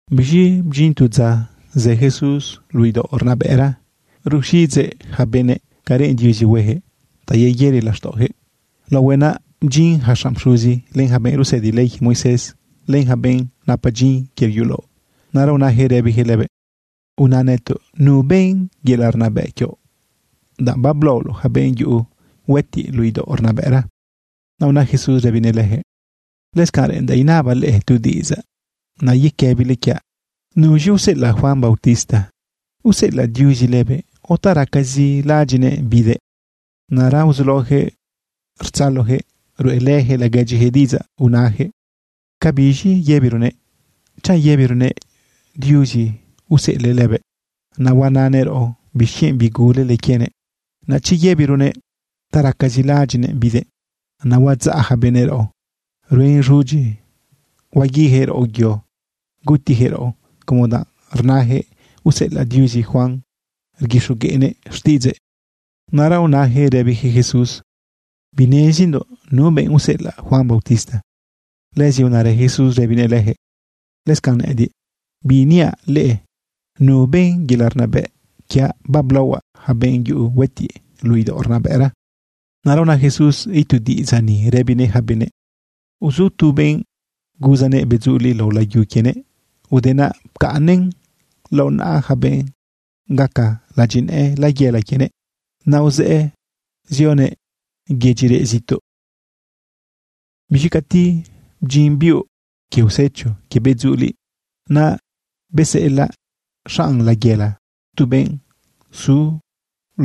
Biz̃i bdyin tu dza zë Jesús luꞌu idaoꞌ rnabëꞌra ruxiꞌidzëꞌ yaca benëꞌ ca reꞌen Diuzi hueyaquëꞌ ta yeyëri laxtaꞌoyaquëꞌ laohuëꞌ. Naꞌ bdyin yaca xanꞌ pxuzi, len yaca benꞌ rusëdi ley quie Moisés, len yaca benꞌ napa dyin quie yulaoꞌ. Naꞌra unayaquëꞌ rëbiyaquëꞌ lëbëꞌ: ―Una nëtoꞌ ¿nu ben yelaꞌ rnabëꞌ quioꞌ, danꞌ bablaoloꞌ yaca benꞌ yuꞌu huëtiꞌ luꞌu idaoꞌ rnabëꞌra? Naꞌ una Jesús rëbinëꞌ leyaquëꞌ: ―Lëscanꞌ reꞌendaꞌ inabaꞌ leꞌe tu diꞌidzaꞌ. Naꞌ yequëbile quiaꞌ: ¿Nuz̃i useꞌelaꞌ Juan bautista? ¿Useꞌelaꞌ Diuzi lëbëꞌ o ta racazi laꞌadyiꞌnëꞌ bidëꞌ? Naꞌra uzulaoyaquëꞌ rtzaloyaquëꞌ ruꞌelëyaquëꞌ laguedyiyaquëꞌ diꞌidzaꞌ unayaquëꞌ: ―¿Cabiz̃i yëbironëꞌ? Chanꞌ yëbironëꞌ: “Diuzi useꞌelëꞌ lëbëꞌ”, naꞌ huanëꞌ raꞌo: “¿Bixquienꞌ bigulele quienëꞌ?” Naꞌ chi yëbironëꞌ: “Ta racazi laꞌadyiꞌnëꞌ bidëꞌ”, naꞌ huadzaꞌ yaca benëꞌ raꞌo, ruen z̃udyi huaguiyaquëꞌ raꞌo yo, gutiyaquëꞌ raꞌo como danꞌ rnayaquëꞌ useꞌelaꞌ Diuzi Juan rguixogueꞌnëꞌ xtiꞌidzëꞌ. Naꞌra unayaquëꞌ rëbiyaquëꞌ Jesús: ―Binezindoꞌ nu benꞌ useꞌelaꞌ Juan bautista. Lëzi unarë Jesús rëbinëꞌ leyaquëꞌ: ―Lëscanꞌ nëꞌëdiꞌ, biiniaꞌ leꞌe nu ben yelaꞌ rnabëꞌ quiaꞌ bablaohuaꞌ yaca benꞌ yuꞌu huëtiꞌ luꞌu idaoꞌ rnabëꞌra. Naꞌra una Jesús itu diꞌidzaꞌ ni rëbinëꞌ yaca benëꞌ: ―Uzu tu benꞌ guzanëꞌ bedzuliꞌ lao layu quienëꞌ. Ude naꞌ pcaꞌnnëꞌn lao naꞌa yaca benꞌ gaca ladyinëꞌë layela quienëꞌ. Naꞌ uzëꞌë zioguëꞌ yedyi reꞌ zituꞌ. Biz̃i cati bdyin biuꞌ quie usecho quie bedzuliꞌ, naꞌ beseꞌelaꞌ xanꞌ layela tu benꞌ zu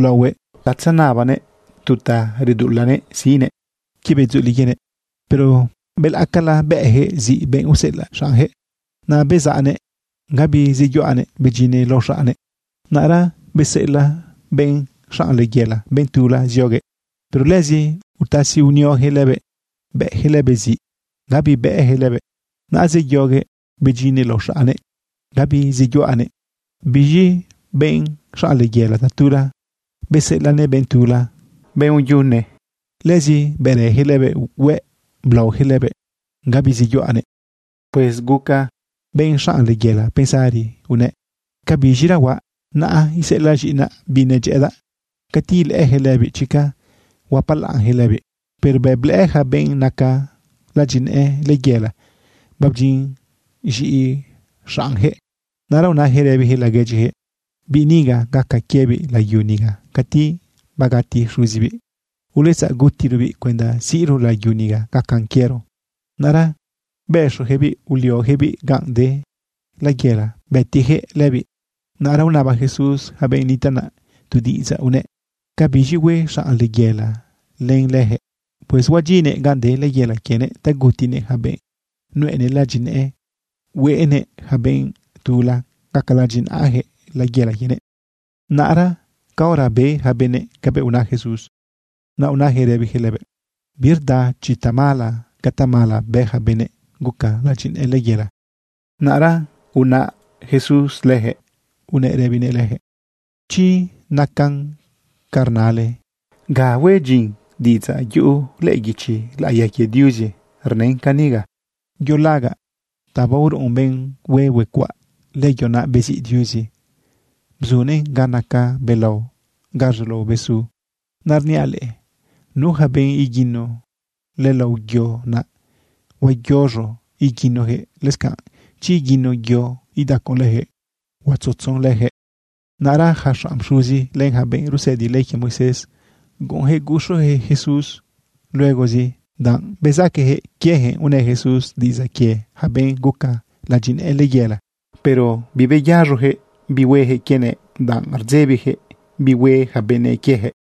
laohuëꞌ ta tzenabanëꞌ tu ta reduꞌulanëꞌ siꞌnëꞌ quie bedzuliꞌ quienëꞌ. Pero belaꞌcala bëꞌyaquëꞌ ziꞌ benꞌ useꞌelaꞌ xaꞌnyaquëꞌ. Naꞌ bezaꞌnëꞌ gabi zeyuꞌanëꞌ, bedyinëꞌ lao xaꞌnnëꞌ. Naꞌra beseꞌelaꞌ benꞌ xanꞌ layela benꞌ tula zioguëꞌ. Pero lëzi utasi unioyaquëꞌ lëbëꞌ, bëꞌyaquëꞌ lëbëꞌ ziꞌ, gabi bëꞌyaquëꞌ lëbëꞌ. Naꞌ zeyoguëꞌ bedyinëꞌ lao xaꞌnnëꞌ, gabi zeyuꞌanëꞌ. Biz̃i benꞌ xanꞌ layela, tatula beseꞌelaꞌnëꞌ benꞌ tula, benꞌ uyune. Lëzi bërëyaquëꞌ lëbëꞌ hueꞌ, blaoyaquëꞌ lëbëꞌ, gabi zeyuꞌanëꞌ. ’Pues guca benꞌ xanꞌ layela pensari unëꞌ: “¿Ca biz̃ira huaꞌ? Naꞌ iseꞌelaꞌ z̃iꞌinaꞌ biꞌ nedyëꞌëdaꞌ. Cati ilëꞌëyaquëꞌ lëbiꞌ, chica huapalaꞌnyaquëꞌ lëbiꞌ.” Pero bëꞌ blëꞌë yaca benꞌ naca ladyinëꞌë layela babdyin z̃iꞌi xaꞌnyaquëꞌ, naꞌra unayaquëꞌ rëbiyaquëꞌ laguedyiyaquëꞌ: “Biꞌ niga gaca quiebiꞌ layu niga cati bagati xuzibiꞌ. Uletzaꞌ gutirobiꞌ cuenda siꞌro layu niga gacan quiero.” Naꞌra bëxoyaquëꞌbiꞌ, ulioyaquëꞌbiꞌ ganꞌ de layela, bëtiyaquëꞌ lëbiꞌ. Naꞌra unaba Jesús yaca benꞌ nitaꞌ naꞌ tu diꞌidzaꞌ unëꞌ: ―¿Cabiz̃i hue xanꞌ layela len leyaquëꞌ? Pues huedyinnëꞌ ganꞌ de layela quienëꞌ ta gutinëꞌ yaca benꞌ nuꞌenëꞌ ladyinëꞌë, hueꞌnëꞌ yaca benꞌ tula gaca ladyinaꞌayaquëꞌ layela quienëꞌ. Naꞌra caora be yaca benëꞌ cabëꞌ una Jesús, naꞌ unayaquëꞌ rëbiyaquëꞌ lëbëꞌ: ―Birda chi tamala ca tamala bë yaca benꞌ guca ladyinëꞌë layela. Naꞌra unaꞌ Jesús leyaquëꞌ unëꞌ rëbinëꞌ leyaquëꞌ: ―Chi nacan canꞌ rnale, ¿ga huen dyin diꞌidzaꞌ yuꞌu lëꞌë guichi laꞌiya quie Diuzi rnën caniga?: Yo lagaꞌ ta baoruꞌun benꞌ hue huecuaꞌ, lëyo naꞌ beziꞌ Diuzi bzunëꞌn ga naca belao, ga rzulao besu. Naꞌ rniaꞌ leꞌe, nu yaca benꞌ iguino lëlao yo naꞌ, huayoz̃o iguinoyaquëꞌ. Lëscanꞌ chi iguino yo idacon leyaquëꞌ, huatzutzon leyaquëꞌ. Naꞌra yaca xanꞌ pxuzi, len yaca benꞌ rusëdi ley quie Moisés, guꞌunyaquëꞌ guxuyaquëꞌ Jesús luegozi, danꞌ bezaqueyaquëꞌ quieyaquëꞌ unë Jesús diꞌidzaꞌ quie yaca benꞌ guca ladyinëꞌë layela. Pero bibeyaz̃oyaquëꞌ bi hueyaquëꞌ quienëꞌ, danꞌ rdzebiyaquëꞌ bi hue yaca benëꞌ quieyaquëꞌ.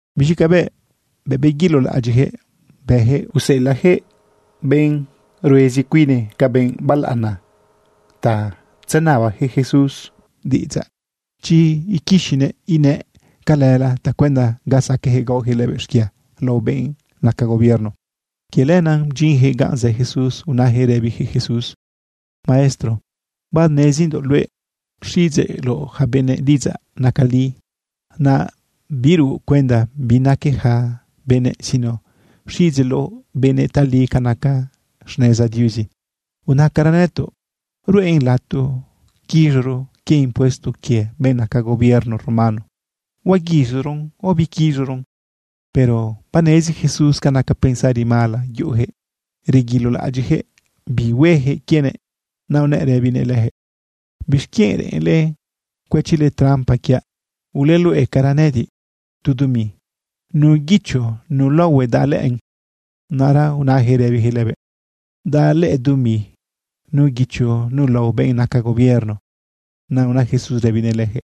Biz̃i cabëꞌ beguilolaꞌadyiꞌyaquëꞌ bëyaquëꞌ, useꞌelaꞌyaquëꞌ benꞌ ruezi cuine ca benꞌ balaꞌana ta tzenabayaquëꞌ Jesús diꞌidzaꞌ chi iquixinëꞌ inëꞌ calëla tacuenda ga saqueꞌ gaoyaquëꞌ lëbëꞌ xquia lao benꞌ naca gobierno. Quie lenaꞌ bdyinyaquëꞌ ganꞌ zë Jesús unayaquëꞌ rëbiyaquëꞌ Jesús: ―Maestro, banezindoꞌ luëꞌ rxiꞌidzeꞌloꞌ yaca benëꞌ diꞌidzaꞌ naca li. Naꞌ biruꞌ cuenda bi naque yaca benëꞌ, sino rxiꞌidzeꞌloꞌ benëꞌ tali ca naca xneza Diuzi. Unacara nëtoꞌ: ¿Ruꞌen lato quiz̃oro quie impuesto quie benꞌ naca gobierno romano? ¿Huaguiz̃oron o biquiz̃oron? Pero banezi Jesús ca naca pensari mala yuꞌuyaquëꞌ reguilolaꞌadyiꞌyaquëꞌ bi hueyaquëꞌ quienëꞌ. Naꞌ unëꞌ rëbinëꞌ leyaquëꞌ: ―¿Bixquienꞌ reꞌenle cuëchile trampa quiaꞌ? Uleuluꞌecara nëꞌëdiꞌ tu dumi. ¿Nu guicho, nu laohue daꞌ lëꞌën? Naꞌra unayaquëꞌ rëbiyaquëꞌ lëbëꞌ: ―Daꞌ lëꞌë dumi nu guicho, nu lao benꞌ naca gobierno. Naꞌ una Jesús rëbinëꞌ leyaquëꞌ: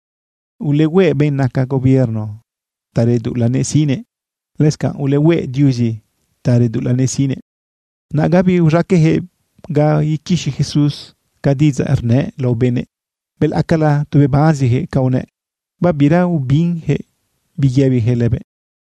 ―Ulehueꞌ benꞌ naca gobierno ta reduꞌulanëꞌ siꞌnëꞌ. Lëscanꞌ ulehueꞌ Diuzi ta reduꞌulanëꞌ siꞌnëꞌ. Naꞌ gabi uz̃aqueꞌyaquëꞌ ga iquixi Jesús ca diꞌidzaꞌ rnëꞌ lao benëꞌ. Belaꞌcala tu bebanziyaquëꞌ canꞌ unëꞌ. Babira biubinyaquëꞌ bi yëbiyaquëꞌ lëbëꞌ.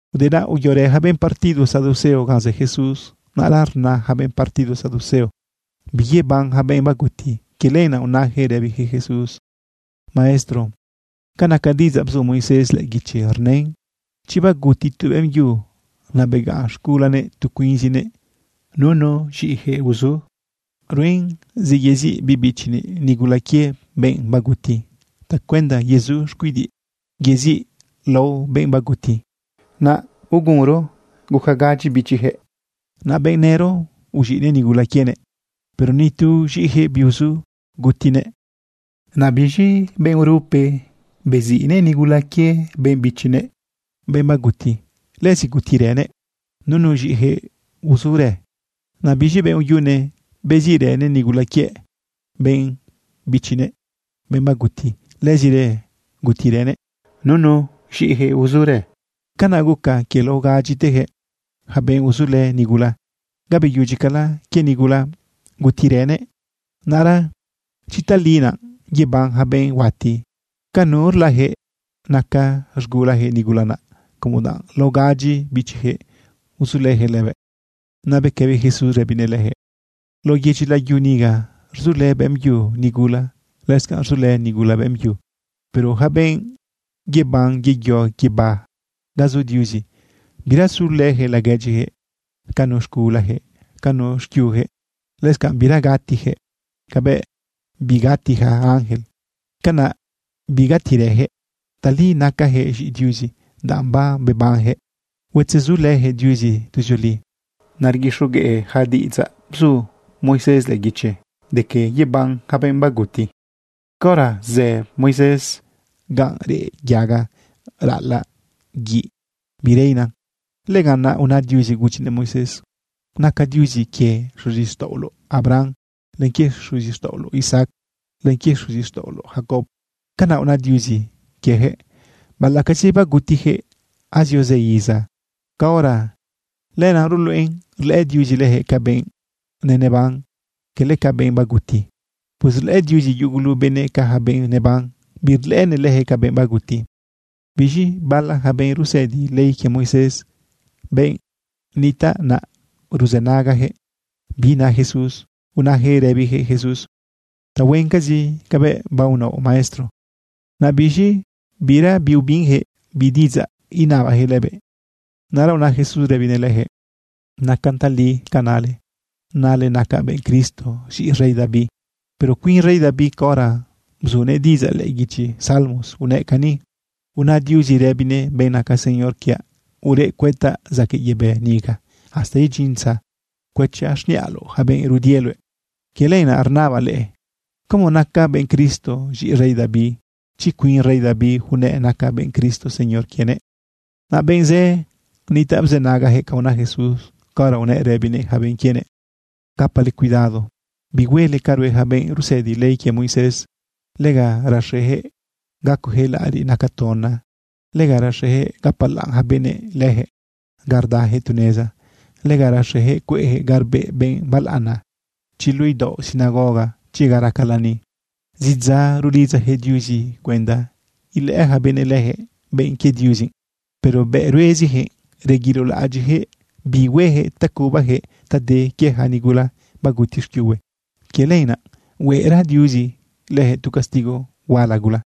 Ude naꞌ uyorë yaca benꞌ partido saduceo ganꞌ zë Jesús. Naꞌra rna yaca benꞌ partido saduceo biyeban yaca benꞌ baguti. Quie lenaꞌ unayaquëꞌ rëbiyaquëꞌ Jesús: ―Maestro, ca naca diꞌidzaꞌ bzu Moisés lëꞌë guichi, rnën chi baguti tu beꞌmbyu, naꞌ begaꞌn z̃gulanëꞌ tu cuinzëꞌ, nunu z̃iꞌiyaquëꞌ uzu, ruen zi yeziꞌ biꞌ bichinëꞌ nigula quie benꞌ baguti tacuenda yezu xcuidiꞌ yeziꞌ lao benꞌ baguti. Naꞌ ugunro guca gadyi bichiyaquëꞌ. Naꞌ benꞌ nëro uz̃iꞌnëꞌ nigula quienëꞌ. Pero ni tu z̃iꞌiyaquëꞌ biuzu gutinëꞌ. Naꞌ biz̃i benꞌ urupe beziꞌnëꞌ nigula quie benꞌ bichinëꞌ, benꞌ baguti. Lëzi gutirënëꞌ, nunu z̃iꞌiyaquëꞌ uzurë. Naꞌ biz̃i benꞌ uyune beziꞌrënëꞌ nigula quie benꞌ bichinëꞌ, benꞌ baguti. Lëzirë gutirënëꞌ nunu z̃iꞌiyaquëꞌ uzurë. Canaꞌ guca quie lao gadyiteyaquëꞌ, yaca benꞌ uzulë nigula. Ga beyudyicala quie nigula, gutirënëꞌ. Naꞌra chi tali naꞌ yeban yaca benꞌ huati, ¿ca nurlayaquëꞌ naca z̃gulayaquëꞌ nigula naꞌ, como danꞌ lao gadyi bichiyaquëꞌ uzulëyaquëꞌ lëbëꞌ? Naꞌ bequëbi Jesús rëbinëꞌ leyaquëꞌ: ―Lao yedyi layu niga rzulë beꞌmbyu nigula, lëscanꞌ rzulë nigula beꞌmbyu. Pero yaca benꞌ yeban yeyo guibá ga zu Diuzi, bira sulëyaquëꞌ laguedyiyaquëꞌ ca nu z̃gulayaquëꞌ, ca nu xquiuyaquëꞌ. Lëscanꞌ bira gatiyaquëꞌ. Cabëꞌ bigati yaca ángel, canaꞌ bigatirëyaquëꞌ. Tali nacayaquëꞌ z̃iꞌi Diuzi, danꞌ babebanyaquëꞌ huatzezulëyaquëꞌ Diuzi tuzioli. Naꞌ rguixogueꞌ yaca diꞌidzaꞌ bzu Moisés lëꞌë guichi de que yeban yaca benꞌ baguti. Caora zë Moisés ganꞌ reꞌ yaga raꞌalaꞌ guiꞌ bireina, lëganꞌ naꞌ una Diuzi gudyinëꞌ Moisés: “Nacaꞌ Diuzi quie xuzixtaꞌoloꞌ Abraham, len quie xuzixtaꞌoloꞌ Isaac, len quie xuzixtaꞌoloꞌ Jacob.” Canaꞌ una Diuzi quieyaquëꞌ, baꞌalaꞌcazi bagutiyaquëꞌ azio zë iza caora. Lenaꞌ ruluꞌen rlëꞌë Diuzi leyaquëꞌ ca benꞌ neneban, cala ca benꞌ baguti. Pues rlëꞌë Diuzi yugulu benëꞌ ca yaca benꞌ neban. Birlëꞌënëꞌ leyaquëꞌ ca benꞌ baguti. Biz̃i bala yaca benꞌ rusëdi ley quie Moisés, benꞌ nitaꞌ naꞌ, ruzënagayaquëꞌ bi na Jesús, unayaquëꞌ rëbiyaquëꞌ Jesús: ―Tahuencazi cabëꞌ baonaoꞌ, Maestro. Naꞌ biz̃i bira biubinyaquëꞌ bi diꞌidzaꞌ inabayaquëꞌ lëbëꞌ. Naꞌra una Jesús rëbinëꞌ leyaquëꞌ: ―Nacan tali ca nale, nale naca benꞌ Cristo z̃iꞌi rey David. Pero cuin rey David, caora bzunëꞌ diꞌidzaꞌ lëꞌë guichi Salmos, unëꞌ cani: Una Diuzi rëbinëꞌ benꞌ naca Señor quiaꞌ: “Ureꞌ cuëtaꞌ zaquëꞌ yebë niga, hasta idyin dza cuëchaꞌ xniꞌaloꞌ yaca benꞌ rudie luëꞌ.” Quie lenaꞌ rnabaꞌ leꞌe: ¿Cómo naca benꞌ Cristo z̃iꞌi rey David, chi cuin rey David unëꞌ naca benꞌ Cristo Señor quienëꞌ? Naꞌ benꞌ zë nitaꞌ bzënagayaquëꞌ ca una Jesús caora unëꞌ rëbinëꞌ yaca benꞌ quienëꞌ: ―Gapale cuidado bihuele ca rue yaca benꞌ rusëdi ley quie Moisés. Lega rexeyaquëꞌ gacoyaquëꞌ laꞌariꞌ naca tona. Lega rexeyaquëꞌ gapalaꞌn yaca benëꞌ leyaquëꞌ ga rdayaquëꞌ tu neza. Lega rexeyaquëꞌ cueꞌyaquëꞌ ga rbeꞌ benꞌ balaꞌana, chi luꞌu idaoꞌ sinagoga, chi ga raca lani. Zidza rulidzayaquëꞌ Diuzi cuenda ilëꞌë yaca benëꞌ leyaquëꞌ benꞌ quie Diuzi, pero bëꞌ rueziyaquëꞌ reguilolaꞌadyiꞌyaquëꞌ bi hueyaquëꞌ ta cubayaquëꞌ ta de quie yaca nigula baguti xquiuhue. Quie lenaꞌ huera Diuzi leyaquëꞌ tu castigo huala gula.